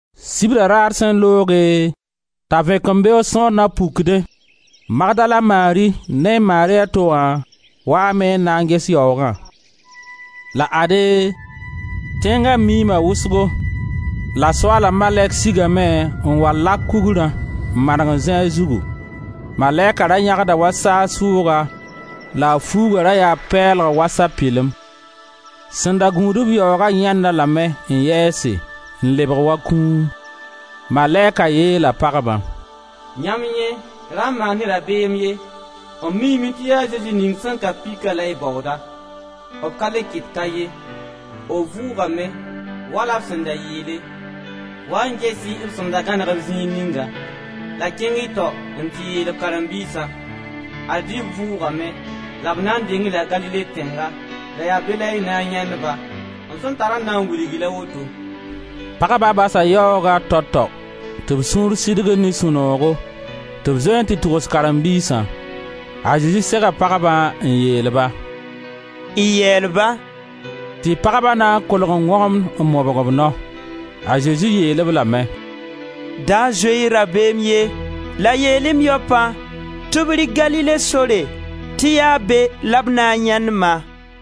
Sibra raar sẽn looge t'a vẽkembeoog sõor nan pukdẽ, Magdala Mari ne Mari a to wã waame n na ges yaoogã. La ade, tẽnga miima wʋsgo la Soaala malɛk sigame n wa lak kugrã n maneg n zĩ a zugu. Malɛka ra yãgda wa saag sʋʋga la a fuuga ra yaa pɛɛlg wa sapɩlem. Sẽn da gũud-b yaoogã yãend-a lame n yɛɛse n lebg wa kũum. Malɛka yeela pagbã: «Yãmb yẽ, ra maan-y rabeem ye, m miime tɩ yaa Zezi ning sẽn ka pika la y baooda; b ka le ket ka ye, b vʋʋgame, wala b sẽn da yeele. Waa-y n ges-y b sẽn da gãneg-b zĩig ninga. La kẽng-y tao n tɩ yeel b karen-biisã: ad-y b vʋʋgame la b na n deng-y la Galile tẽnga, la yaa be la y na n yãend-ba. M sẽn da tar n na n wilg-y la woto.» Pagba basa yaooga tao-tao tɩ b sũur sidgd ne sũ-noogo tɩ b zoe n tɩ togs karen-biisã. A Zezi sega pagbã, n yeel-ba: «Y yɛɛl ba!» Tɩ pagba na n kolg n wõgemd n mobg b nao. A Zezi yeel-b lame: «Da zoe-y rabeem ye la yeel-y m yaopã tɩ b rɩk Galile sore tɩ yaa be la b na n yãend-ma.»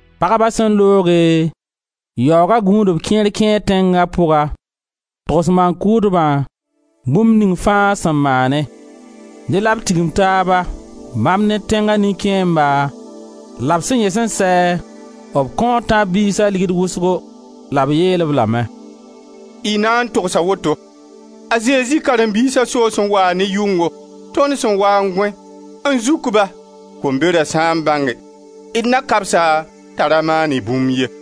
Pagba sẽn looge, yaooga gũudb kẽer kẽ tẽnga pʋga n togs maan-kʋʋdba bũmb ning fãa sẽn maane. Dẽ la b tigim taaba, bãmb ne tẽnga nin-kẽemba la b sẽn yẽs n sɛ, b kõo tãb-biisa ligd wʋsgo, la b yeel-b lame: «Y na n togsa woto: ‹A Zezi karen-biisã soos n waa ne yʋngo, tõnd sẽn waa n gõe, n zuk ba.› Kombera sã n bãnge d na kabs-a t'a ra maan-y bũmb ye.»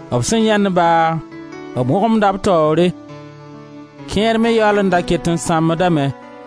B sẽn yãend-ba, b wõgemda b taoore, kẽer me yaool n da ket n sãmbdame.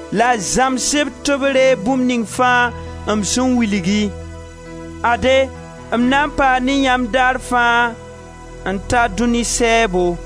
la y zãms-b tɩ b reeg bũmb ning fãa m sẽn wilg-y. Ade m na n paa ne yãmb, daar fãa, n ta dũni sɛɛbo.»